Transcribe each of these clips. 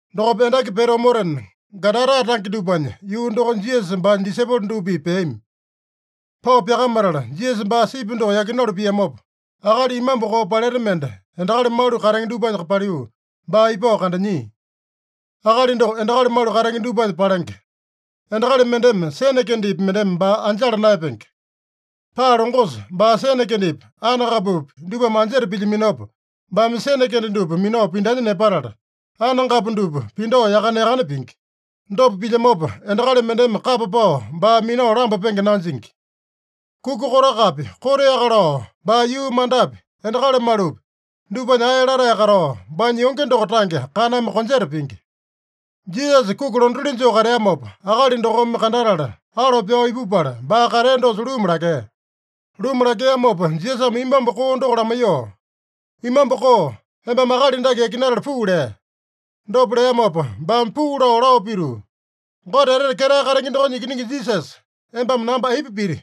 Dokopa endaki pete omotena, Gadara tange dupanya yuu dokonya Jisasa baanya disaipolo dupa-pipa peami. Pao pyakamatala, Jisasa baa sipi doko yakinalu piamopa, akali imambu koo paleta mende endakali malu katenge dupanya paliu ipao baa kandanyia. Akali doko endakali malu katenge dupanya palenge. Endakali mendeme sene kendepi mendeme baa anjala naeyapenge. Paa longosa baa sene kendepi, anengapupi dupame anjeta pilyaminopa, baame sene kende dupa minao pindanya nepatala, anengapu dupa pindao yakane-yakane pingi. Dopa pilyamopa, endakali mendeme kapa pao baa minao lambapenge nanjingi. Kuka kotakapi, koteaka lao baa yuu mandapi, endakali malupi dupanya ae latae katao, baanya yonge doko tange kaname konjeta pingi. Jisasa kuki londatili joo kateamopa, akali dokome kandatala, alo pyao ipupala, baa katea dosa luma lakea. Luma lakeamopa Jisasame imambu koo doko lamaiyoo, “Imambu koo, embame akali dake yakinatala puu” lea. Dopa leamopa baame puu lao, lao pituu, “Gote Etete Ketae Katenge dokonya Ikiningi Jisasa, embame namba aipa piti?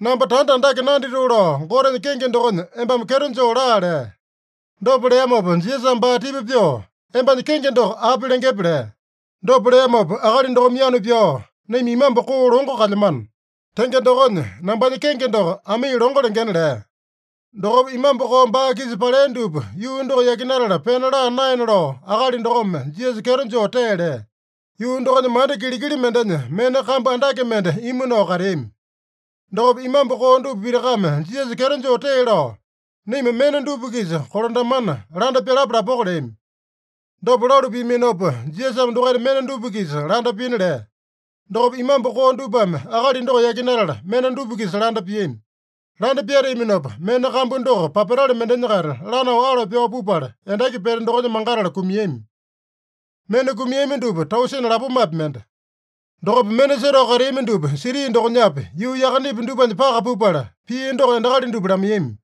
Namba tanda andake nanditoo lao Gotenya kenge dokonya embame kyeto joo laa” lea. Dopa leamopa Jisasame baa tipa pyoo, “Embanya kenge doko api lengepe?” lea. Dopa leamopa akali dokome yanu pyao, “Naima imambu koo longo kalyamano. Tenge dokonya, nambanya kenge doko Amii Longo lengena” lea. Dokopa imambu koo baa-kisa palea dupa yuu doko yakinatala pena laa naena lao akali dokome Jisasa kyeto joo tee lea. Yuu dokonya manda kilikili mendenya mena kambu andake mende imu nao kateami. Dokopa imambu koo dupa pitakame Jisasa kyeto joo tee lao, “Naima mena dupa-kisa kolandamana, landa pyalapa lapoko” leami. Dopa lalu piaminopa, Jisasame dokaita mena dupa-kisa landa pina lea. Dokopa imambu koo dupame akali doko yakinatala, mena dupa-kisa landa piami. Landa pyateaminopa, mena kambu doko papatale mendenya-kaita lanao alo pyao pupala, endaki pete dokonya mangatala kumiami. (Mena kumiami dupa, tausene lapomapi mende.) Dokopa mena setao kateami dupa siti dokonyapi, yuu yakanepi, dupanya paka pupala, pia doko endakali dupa lamaiyami.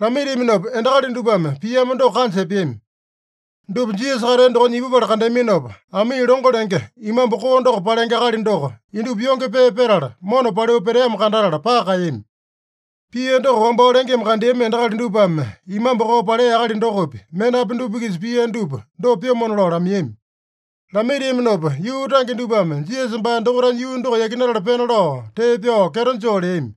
Lamaitiaminopa endakali dupame piamo doko kanja epeami. Dupa Jisasa katea dokonya ipupala kandeaminopa, Amii longo lenge imambu koo doko palenge akali doko indupa yonge pee petala, mona paliu peteamo kandatala paka kaeyami. Pia doko wambao lengeme kandeami endakali dupame imambu koo palea akali dokopi, menapi dupa-kisa pia dupa dopa pyomona lao lamaiyami. Lamaitiaminopa yuu tange dupame Jisasa baa dokaitanya yuu doko yakinatala pena lao tee pyao kyeto joo leami.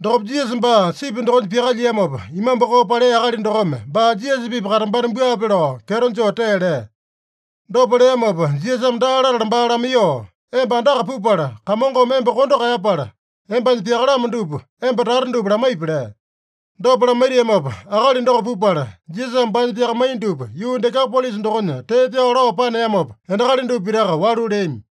Dokopa, Jisasa baa sipi dokonya pyakalyiamopa, imambu koo palea akali dokome baa Jisasa-pipa katambana buape lao kyeto joo tee lea. Dopa leamopa Jisasame daa latala baa lamaiyoo, “Emba andaka pupala, Kamongome emba kondo kaeyapala, embanya pyakalamo dupa emba tata dupa lamaipi” lea. Dopa lamaitiamopa akali doko pupala, Jisasame baanya pyakamaiya dupa yuu Dekapolisa dokonya tee pyao lao paneamopa, endakali dupa pitaka walu leami.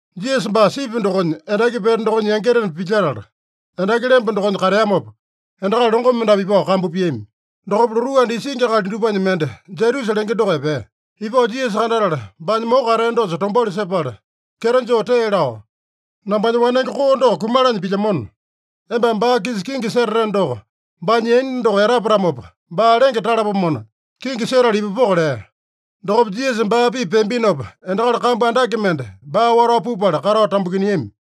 Jisasa baa sipi dokonya, endaki pete dokonya yangitena pilyetala, endaki lemba dokonya kateamopa, endakali longo mendapu ipao kambu piami. Dokopa lotuu anda isingi akali dupanya mende, Jairusa lenge doko epea. Ipao Jisasa kandatala, baanya moko katea dosa tombauli sepala kyeto joo tee lao, “Nambanya wanenge koo doko kumalanya pilyamona, embame baa-kisa kingi setateno doko, baanya yaina doko etapatamopa baa lenge talapomona, kingi setala ipupoko” lea. Dokopa Jisasa baa-pipa peambinopa, endakali kambu andake mende baa watao pupala, katao tambukiniami.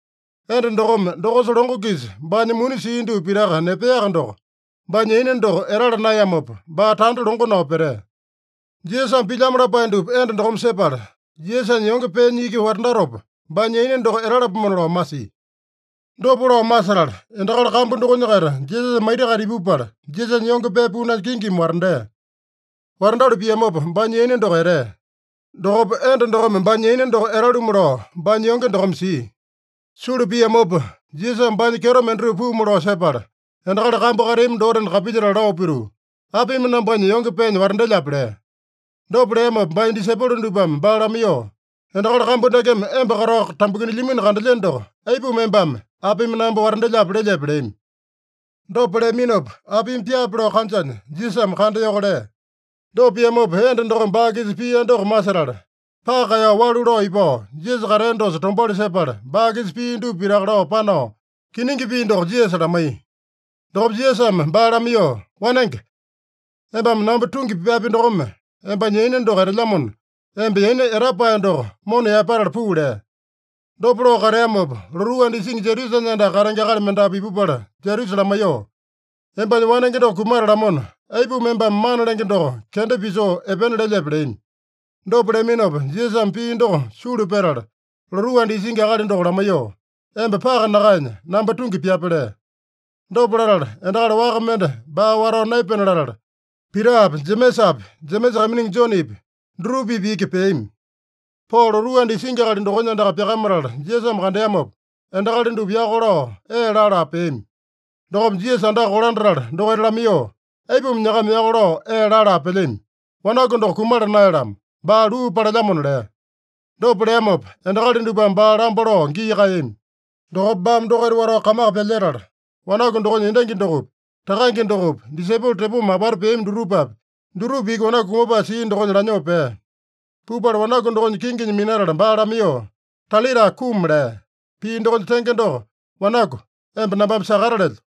Enda dokome dokosa longo-kisa baanya muni sia dupa pitaka nepeaka doko, baanya yaina doko etala naeyamopa, baa tanda longo nao petea. Jisasame pilyamo lapae dupa enda dokome sepala, Jisasanya yonge peenya iki watandatopa, baanya yaina doko etalapomona lao masia. Dopa lao masetala, endakali kambu dokonya-kaita Jisasanya maita-kaita ipupala, Jisasanya yonge pee punanya kingimi watandea. Watandalu piamopa baanya yaina doko etea. Dokopa enda dokome baanya yaina doko etalumu lao baanya yonge dokome sia. Sulu piamopa, Jisasame baanya kyeto mendatupa puumu lao sepala, endakali kambu kateami dotena kapilyetala lao pituu, “Apimi nambanya yonge peenya watandelyape?” lea. Dopa leamopa baanya disaipolo dupame baa lamaiyoo, “Endakali kambu dakeme emba katao tambukinilyamino kandelyeno doko, aipuma embame, ‘Apimi namba watandelyape?’ lelyepe?” leami. Dopa leaminopa, apimi pyaape lao kanjanya, Jisasame kandayoko lea. Dopa piamopa, enda dokome baa-kisa pia doko masetala, paka kaeyao walu lao ipao, Jisasa katea dosa tombauli sepala, baa-kisa pia dupa pitaka lao panao kiningi pii doko Jisasa lamaiya. Dokopa Jisasame baa lamaiyoo, “Wanenge, embame namba tungi pyapi dokome, embanya yaina doko etelyamona, emba yaina etapae doko mona yaepatala puu” lea. Dopa lao kateamopa, lotuu anda isingi Jairusanya andaka katenge akali mendapu ipupala Jairusa lamaiyoo, “Embanya wanenge doko kumatalamona, aipuma embame Mana Lenge doko kenda pisoo epena lelyepe” leami. Dopa leaminopa Jisasame pii doko sulu petala, lotuu anda isingi akali doko lamaiyoo, “Emba paka nakaenya, namba tungi pyape” lea. Dopa latala, endakali waka mende baa watao naepena latala, Pitapi, Jemesapi, Jemesa kaiminingi Jonepi dutupa-pipa iki peami. Pao lotuu anda isingi akali dokonya andaka pyakamatala Jisasame kandeamopa, endakali dupa yako lao ee laa-laa peami. Dokopa Jisasa andaka kolandatala dokaita lamaiyoo, “Aipuma nyakama yako lao ee laa-laa pelyami? Wanaku doko kumala naeyalamo. Baa luu palelyamona” lea. Dopa leamopa, endakali dupame baa lamba lao gii kaeyami. Dokopa baame dokaita watao kamaka pyalyetala, wanaku dokonya endangi dokopi, takange dokopi, disaipolo tepoma apata peami dutupapi, dutupa iki wanaku kumapae sia dokonya lanyoo pea. Pupala wanaku dokonya kinginya minatala baa lamaiyoo, “Talita kum” lea. (Pii dokonya tenge doko, “Wanaku, emba nambame sakata lelyo.”)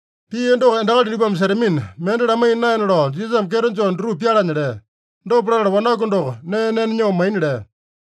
Pia doko endakali dupame setamina, mende lamaiya naena lao Jisasame kyeto joo dutupa pyalanya lea. Dopa latala wanaku doko nee nena nyoo maina lea.